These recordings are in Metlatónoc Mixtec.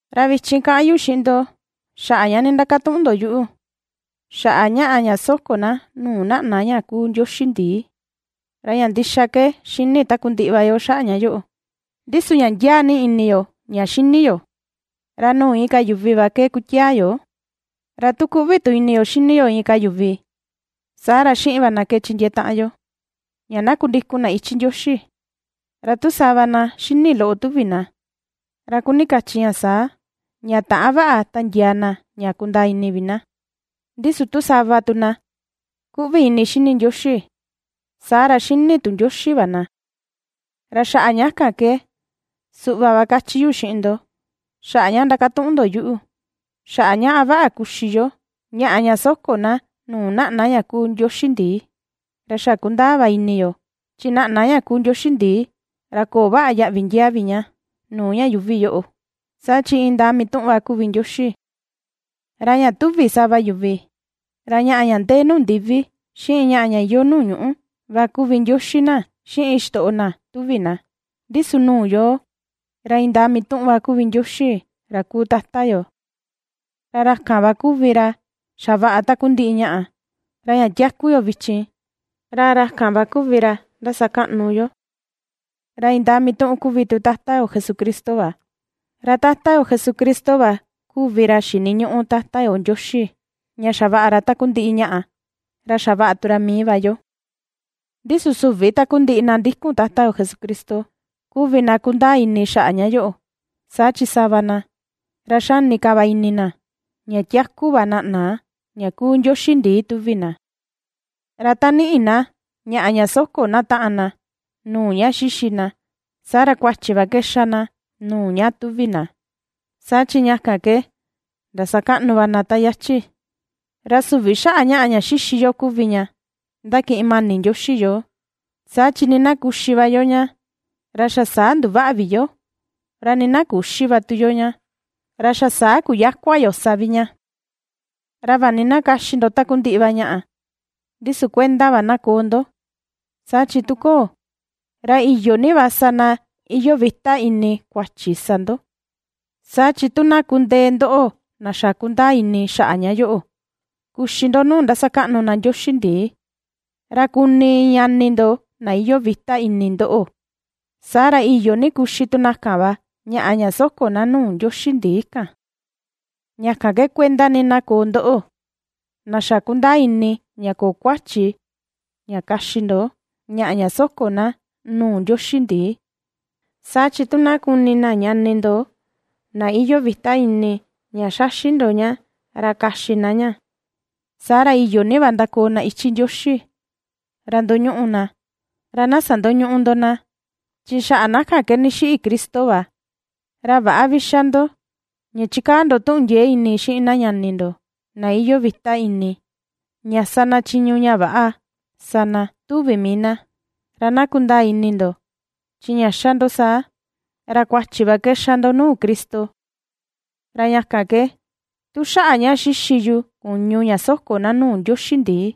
Ra vichin kaꞌan yu xiꞌin ndo, xaꞌa ña nindakatuꞌun ndo yuꞌu xaꞌa ñaꞌa ña ^soko na nuu naꞌna ña kuu ndioxi ndii. Ra ña ndixa ke xini takundiꞌi va yo xaꞌa ña yoꞌo; ndi su ña ndiaa ni ini yo ña xini yo, ra nuu inka yuvi va ke kutiaa yo; ra tu kuꞌvi tu ini yo inka yuvi, saa ra xiꞌin va na ke chindiee taꞌan yo, ña na kundikun na ichi Ndioxi. Ra tu sava na xa xini loꞌo tuvi na, ra kuni kachi ña saa, ña täan vaꞌa tandiaa na ña kundaa ini vi na. Ndi su tu sava tu na ^kuꞌvi ini xini Ndioxi, saa ra xini tu Ndioxi va na. Ra xaꞌa ña kan ke suꞌva va ke kachi yu xiꞌin ndo xaꞌa ña ndakatuꞌun ndo yuꞌu xaꞌa ña a vaꞌa kuxi yo ñaꞌa ña soko na nuu naꞌna ña kuu ndioxi ndii: ra xa kundaa va ini yo, chi naꞌna ña kuu ndioxi ndii, ra köo vaꞌa yaꞌvi ndiaa vi ña nuu ña yuuvi yoꞌo, saa chi indaa mituꞌun va kuvi Ndioxi. Ra ña tuvi sava yuvi, ra ñaꞌa ña ndee nuu ndivi, xiꞌin ñaꞌa ña iyoo nuu ñuꞌu va kuvi ndioxi na, xiꞌin xitoꞌo na tuvi na, ndi su nuu yoo, ra indaa mituꞌun va kuvi Ndioxi, ra kuu Tata yo. Ra ra kan va kuvi ra xavaꞌa takundiꞌi ñaꞌa, ra ña tiaku yo vichin, ra ra kan va kuvi ra ^ndasakaꞌnu yo. Ra indaa mituꞌun kuvi tu Tata yo Jesucristo va. Ra Tata yo Jesucristo va kuvi ra xiniñuꞌu Tata yo Ndioxi ña xavaꞌa ra takundiꞌi ñaꞌa, ra xavaꞌa tu ra mii va yo. Ndi su süvi takundiꞌi na ndikun Tata yo Jesucristo kuvi na kundaa ini xaꞌa ña yoꞌo. Saa chi sava na, ra xani ka va ini na ña tiaku va naꞌna, ña kuu ndioxi ndii tuvi na. Ra ta níꞌi na ñaꞌa ña soko na taꞌan na nuu ña xixi na, saa ra kuachi va ke xa na nuu ña tuvi na, saa chi ña kan ke ndasakaꞌnu va na ta yachi. Ra süvi xaꞌa ñaꞌa ña xixi yo kuvi ña ndakiꞌin mani Ndioxi yoo; saa chi nii na kuxi va yo ña, ra xa saa nduväꞌa vi yo, ra nii na küxi va tu yo ña, ra xa saa kuyäkua yo sa vi ña. Ra vaꞌa ni kuvi kaxi ndo takundiꞌi va ñaꞌa, ndi su kuenda va na koo ndo, saa chi tu köo, ra iyo ni va sa na iyoo vita ini kuachi sa ndo. Saa chi tu na kundee ndoꞌo na xa kundaa ini xaꞌa ña yoꞌo, kuxi ndo nuu ndasakaꞌnu na ndioxi ndii, ra kuni iin ñani ndo na iyoo vita ini ndoꞌo, saa ra iyo ni kuxi tu na kan va ñaꞌa ña soko na nuu ndioxi ndii kan. Ña kan ke kuenda ni na koo ndoꞌo na xa kundaa ini ña köo kuachi ña kaxi ndo ñaꞌa ña soko na nuu ndioxi ndii, saa chi tu na kuni na ñani ndo na iyoo vita ini, ña xaxi ndo ña, ra kaxi na ña, saa ra iyo ni va ndakoo na ichi Ndioxi, ra ndoñuꞌu na; ra na sandoñüꞌu ndo na, chi xaꞌa na kan ke ndixiꞌi Cristo va. Ra väꞌa vi xa ndo ña chikaa ndo tuꞌun ndiee ini xiꞌin na ñani ndo na iyoo vita ini ña sa na chiñu ña väꞌa sa na tuvi mii na, ra na kundaa ini ndo chi ña ^xa ndo saa, ra kuachi va ke xa ndo nuu Cristo. Ra ña kan ke, tu xaꞌa ña xixi yu kuñu ña soko na nuu ndioxi ndii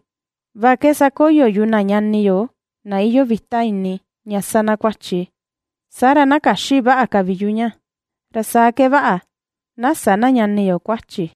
va ke sakoyo yu na ñani yo na iyoo vita ini ña sa na kuachi, saa ra na käxi vaꞌa ka vi yu ña, ra saa ke vaꞌa na sä na ñani yo kuachi.